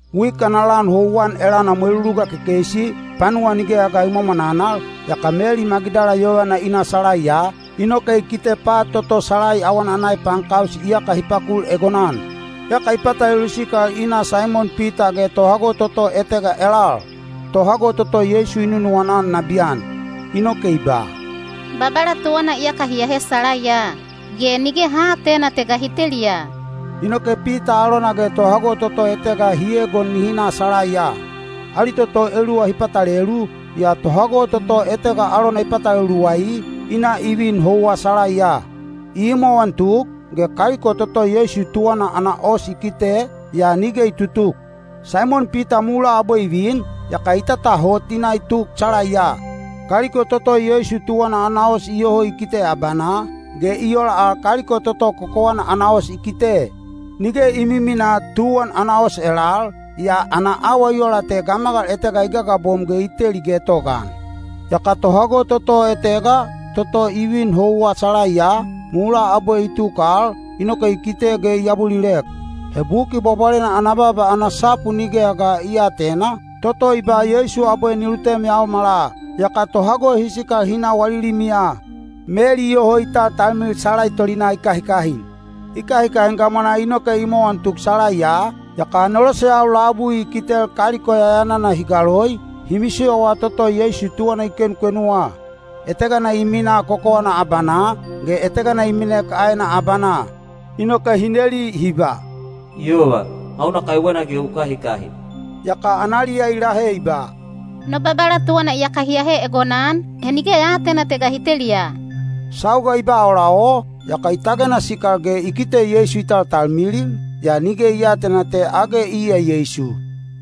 Wik ana lan houwan elana mweluluga kekeisi, panuwa nigeya ga i mwamwananal, yaka Meli Magidala yovana i na salaiya, inoke i kite pat toto salai awana ana epaankaus iyaka hi pakul egonan. Yaka i patalelu sikal i na Saimon Pita ge tohago toto etega elal, tohago toto Yeisu i nunuwana-an nabiyan. Inoke i ba, “Babala tuwana iyaka hi ahe salaiya, ge nige ha aatena te ga hi teliya!” Inoke Pita alona ge tohago toto etega hi egon nihi na salaiya. Ali toto eluwa hi patalelu, yaa tohago toto etega alona i patalelu luwai, i na i vin houwa salaiya. I imowan tuk, ge kaliko toto Yeisu tuwana ana os i kite, yaa nige i tutuk. Saimon Pita mulaa abwe i vin, yaka i tatahot i na i tuk salaiya. Kaliko toto Yeisu tuwana ana os iyoho i kite abanaa, ge i ola al kaliko toto kokowana ana os i kite. Nige i miminaa tuwan ana os elal, yaa ana awa i ola te gamagal etega i gagabom ge i teli getogaan. Yaka tohago toto etega, toto i vin houwa salaiya, mulaa abwe i tuk al, inoke i kite ge i abulilek. (He Buki Bwabwalena ana baaba ana sapu nigeya ga hi aatena, toto i ba Yeisu abwe ni lutem yaomala.) Yaka tohago hi sikal hi na wali limiya. Meli iyoho i taltalmilil salai tolinaa i kahikahin. I kahikahin gamwanaa inoke i imowan tuk salaiya, yaka aneloseyau labui i kitel kaliko yayanana hi galoi, hi misiyowa toto Yeisu tuwana i kenukenuwa. Etegana i minaa kokowana abanaa, ge etegana i minek aena abanaa. Inoke hi neli hi ba, “Yova, hauna kaiwena ge u kahikahin?” Yaka analiya i lahe i ba, “No Babala tuwana iyaka hi ahe egonan, he nige ya aatena te ga hi teliya.” Sauga i ba ola o, yaka i tagena sikal ge i kite Yeisu i taltalmilil, yaa nige i aatena te age iya Yeisu.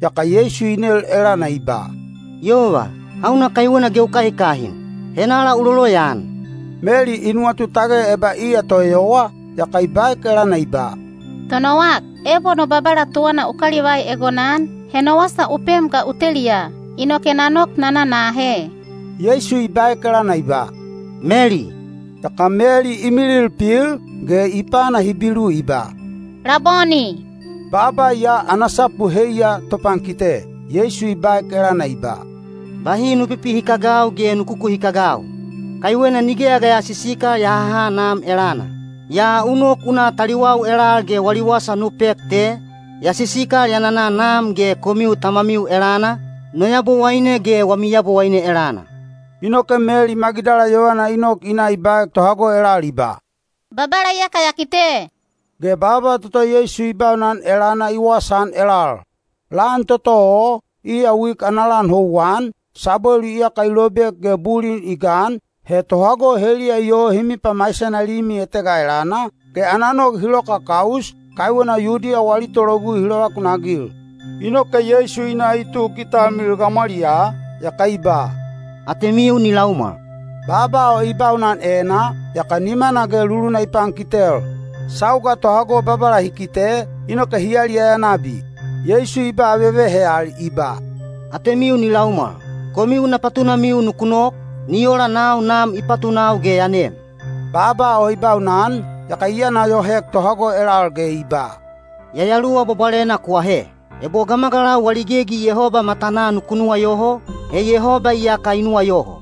Yaka Yeisu i nel elana i ba, “Yova, hauna kaiwena ge u kahikahin? Henala u loloyaan?” Meli i nuwatu tage eba iya toeyowa, yaka i baek elana i ba, “Tonowak, ebo no Babala tuwana u kalivai egonan, he no wasa u pem ga u teliya, inoke na nok na na na ahe.” Yeisu i baek elana i ba, “Meli!” Yaka Meli i milil pil, ge i pana Hibilu i ba, “Laboni!” (Baaba ya ana sapu heiya “topankite.”) Yeisu i baek elana i ba, “Bahi nu pipihikagau ge nu kukuhikagau! Kaiwena nigeya ga ya sisikal ya haha Nam elana. Yaa u nok u na taliwau elal ge wali wasa nu pek te, ‘Ya sisikal ya nana Nam ge komiu Tamamiu elana, no Yabowaine ge wami Yabowaine elana.’” Inoke Meli Magidala yovana i nok i na i baek tohago elal i ba, “Babala iyaka ya kite.” Ge baaba toto Yeisu i baunan elana i wasaan elal. Lan toto o, iya wik ana lan houwan, sabwelu iyaka i lobek ge bulin i gan, he tohago heliya iyoho hi mipamaisena limi etega elana, ge ana nog hi loka kaus, kaiwena Yudiya wali tologugui hi lovakunagil. Inoke Yeisu i na i tuk i talmilil gamwaliyaa, yaka i ba, “Atemiu ni laumwal!” Baaba o i baunan enaa, yaka nimana ge luluna i pankitel. Sauga tohago Babala hi kite, inoke hi yaliyaya nabi. Yeisu i ba vevehe al i ba, “Atemiu ni laumwal! Komiu na patunamiu nuku nok, ni ola nau Nam i patunau ge ya nem.” Baaba o i baunan, yaka i yana yohoek tohago elal ge i ba, “Yayaluwa Bwabwalena ku ahe. Ebo gamagalau wali gegi Yehoba matanaa nuku nuwayoho, he Yehoba iyaka i nuwayoho;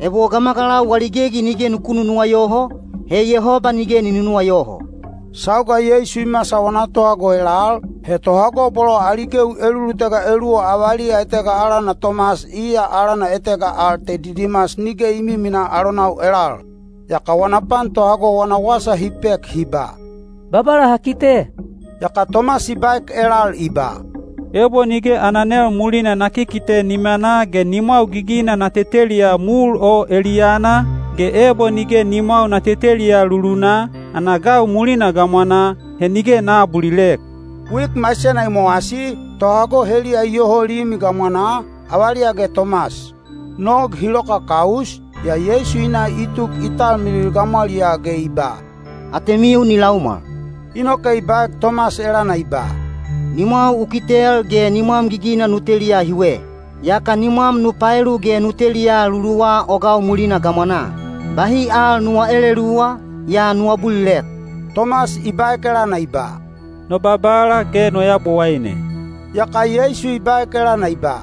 ebo gamagalau wali gegi nige nuku nunuwayoho, he Yehoba nige ni nunuwayoho.” Sauga Yeisu i masal wana tohago elal, he tohago bolo ali gewi elulutega eluwa avaliya etega alana Tomas (iya alana etega al te Didimas) nige i miminaa alonau elal. Yaka wana pan tohago wana wasa hi pek hi ba, “Babala ha kite.” Yaka Tomas i baek elal i ba, “Ebo nige ana nel mulina na kikite nimanaa ge nimwau gigina na teteliya mul o eliyana, ge ebo nige nimwau na teteliya lulunaa, ana gau mulina gamwanaa, he nige na aabulilek.” Wik maisena i mowasi, tohago heliya iyoho limi gamwanaa, avaliya ge Tomas. Nog hi loka kaus, yaa Yeisu i na i tuk i talmilil gamwaliyaa ge i ba, “Atemiu ni laumwal!” Inoke i baek Tomas elana i ba, “Nimwau u kitel ge nimwam gigina nu teliya hiwe. Yaka nimwam nu paelu ge nu teliya luluwa o gau mulina gamwanaa. Bahi al nuwa eleluwa, yaa nu abulilek.” Tomas i baek elana i ba, “No Babala ge no Yabowaine!” Yaka Yeisu i baek elana i ba,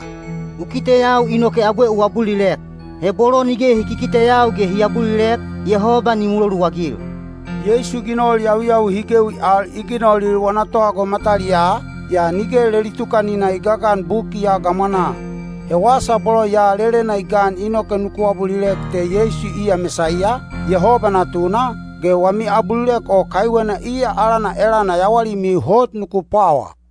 “U kiteyau inoke abwe u abulilek? He bolo nige hi kikiteyau ge hi abulilek, Yehoba ni muloluagil.” Yeisu ginol yawiyawi hi gewi al i ginolil wana tohago mataliyaa, yaa nige leli tukanina i gagan buki ya gamwanaa. He wasa bolo ya lelena i gan inoke nuku abulilek te Yeisu iya Mesaiya, Yehoba Natuna, ge wami abulilek o kaiwena iya alana elana yawalimiu hot nuku pwawa.